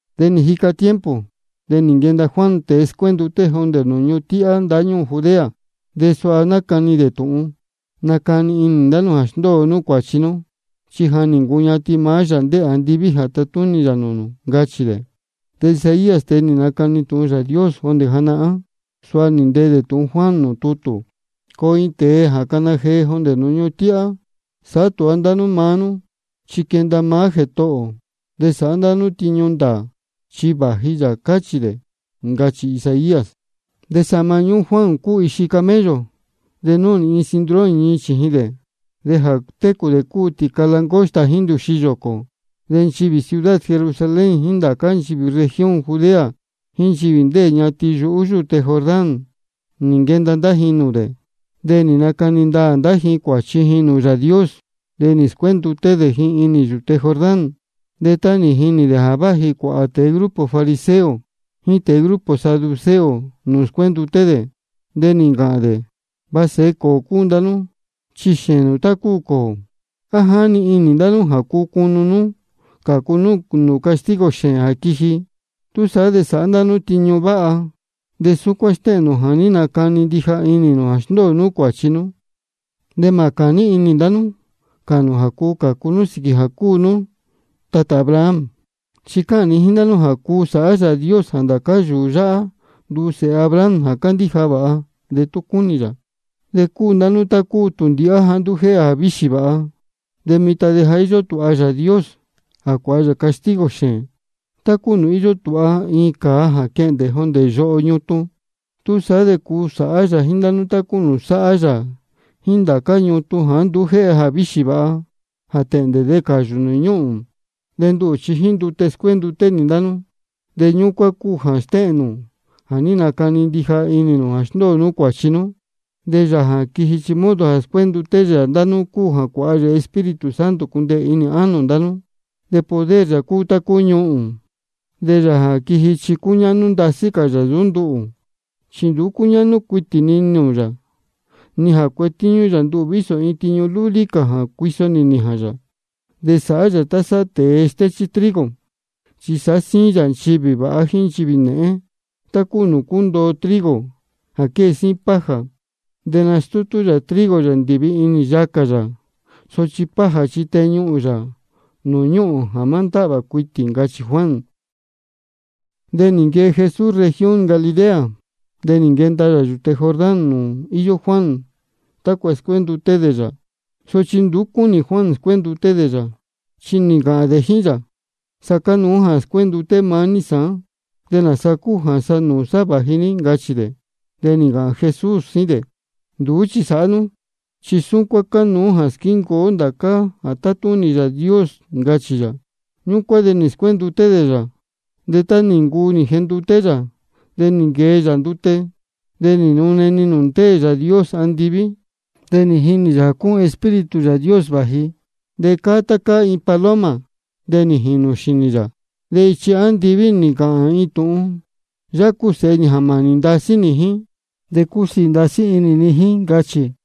De nī jica tiempo, de nī nquenda Juan tēe scuénduté jondē nūū ñuhun tíhá ndáñúū Judea, de suha nácani dē tūhun: Nacani inī ndá nú jā sndóo nú cuāchi nú, chi ja nī ncuñatin maá Yāā ndéē andiví jā tatúnī yā nūū nū, ncachī dē. De Isaías, tēe nī nacani tūhun Yāā Dios jondē janahán, suha nī ntee dē tūhun Juan nūū tutū: Coo iin tēe jā cana jee jondē nūū ñuhun tíhá: Sāhá tūha ndá nú maá nú, chi quenda maá Jētohō ō. De sāhá ndá nú tiñu ndāā, chi vāji yā, cachī dē. Ncachī Isaías. De sahma ñúhún Juan cúu ixi camello, de núhnī iin cinturón ñii chījin dē. De jā técū dē cúu tīca langosta jíín ndūxi yōcō. De nchivī ciudad Jerusalén jíín ndācá nchivī región Judea jíín nchivī ndéē ñatin yuhú yūte Jordán, nī nquenda ndá ji nūū dē. De nī nacani ndaā ndá ji cuāchi ji nūū Yāā Dios, de nī scuénduté dē ji inī yūte Jordán. De tá nī jinī dē jā váji cuāhā tēe grupo fariseo jíín tēe grupo saduceo nūū scuénduté dē, de nī ncāhān dē: Va sēhe cōō cúu ndá nú, chi xēēn nū tá cúu cōō. ¿A jáni inī ndá nú jā cuu cunu nú cācu nú nūū castigo xēēn jā quiji? Túsaá de sāhá ndá nú tiñu váha, de súcuán stéhēn nū jā ní nacani ndija inī nū jā sndóo nú cuāchi nú. De mā cāní inī ndá nú cāhān nū jā cuu cācu nú sīquī jā cúu nú tatā Abraham. Chi cáhān ni jíín ndá nú jā cuu sāhá Yāā Dios jā ndācá yūū yáhá nduu sēhe Abraham jā candíja vāha, de tú cúnī yā. De cúu ndá nú tá cúu tūndīhá jāá nduú jéhe jāvíxī vāha. De mitan de ja íyó tūha Yāā Dios jā cuāha yā castigo xēēn, tá cúu nūū íyó tūha iin cāa jā quehndē jondē yoho ñutun. Túsaá de sāhá yā jíín ndá nú tá cúu nūū sáhá yā jíín ndācá ñutun jāá nduú jéhe jāvíxī vāha, jā tēhndē de cāyū nūū ñúhūn. De nduhū chi jíín ndute scuénduté nī ndá nú, de ñúcuán cúu jā stéhēn nū jā ní nacani inī nū jā sndóo nú cuāchi nú. De Yāā jā quiji, chi modo jā scuénduté yā ndá nú cúu jā cuāha yā Espíritu Santo cundeē inī ánō ndá nú, de poder yā cúu tá cúu ñuhūn. De Yāā jā quiji chi cúñáhnú ndasí cā yā nsūú nduhū. Chi nduú cúñáhnú cuitī ni nūū yā, ni jā cuetíñú yā nduhū vísō iin tiñu lúlí cā jā cuiso nī nījān yā. De sāhá yā tá sáhá tēe stéchí trigo, chi sāhá síín yā nchivī vāha jíín nchivī nēhén, tá cúu nūū cúndoo trigo jā quée síín paja. De nastútú yā trigo yā ndīvi inī yacā yā. Sochi paja chi teñuhūn yā nūū ñúhūn jā má ndáhvā cuitī, ncachī Juan. Ñúcuán de nī nquee Jesús región Galilea, de nī nquenda yā yūte Jordán nūū íyó Juan, tácua scuénduté dē yā. Sochi nduú cúnī Juan scuénduté dē yā, chi nī ncāhān dē jíín yā: Sa cánuú jā scuénduté maá ní sāán, ¿de nāsa cúu jā sa nūū sá vāji ní? ncachī dē. De nī ncāhān Jesús jíín dē: Nduú chi sāhá nú, chi súcuán cánuú jā squíncuu ó ndācá jā tátúnī Yāā Dios, ncachī yā. Ñúcuán de nī scuénduté dē yā. De tá nī ncuu nī jenduté yā, de nī nquee yā ndute. De nī nune-ni nūū ndéē Yāā Dios andiví, de nī jinī yā jā cúun Espíritu Yāā Dios vāji, de cáá tá cáá iin paloma, de nī jīnū xīnī yā. De ichi andiví nī ncāhān iin tūhun: Yáhá cúu Sēhe nī jā mānī ndasí nī jíín, de cúsiī ndasí inī ni jíín, ncachī.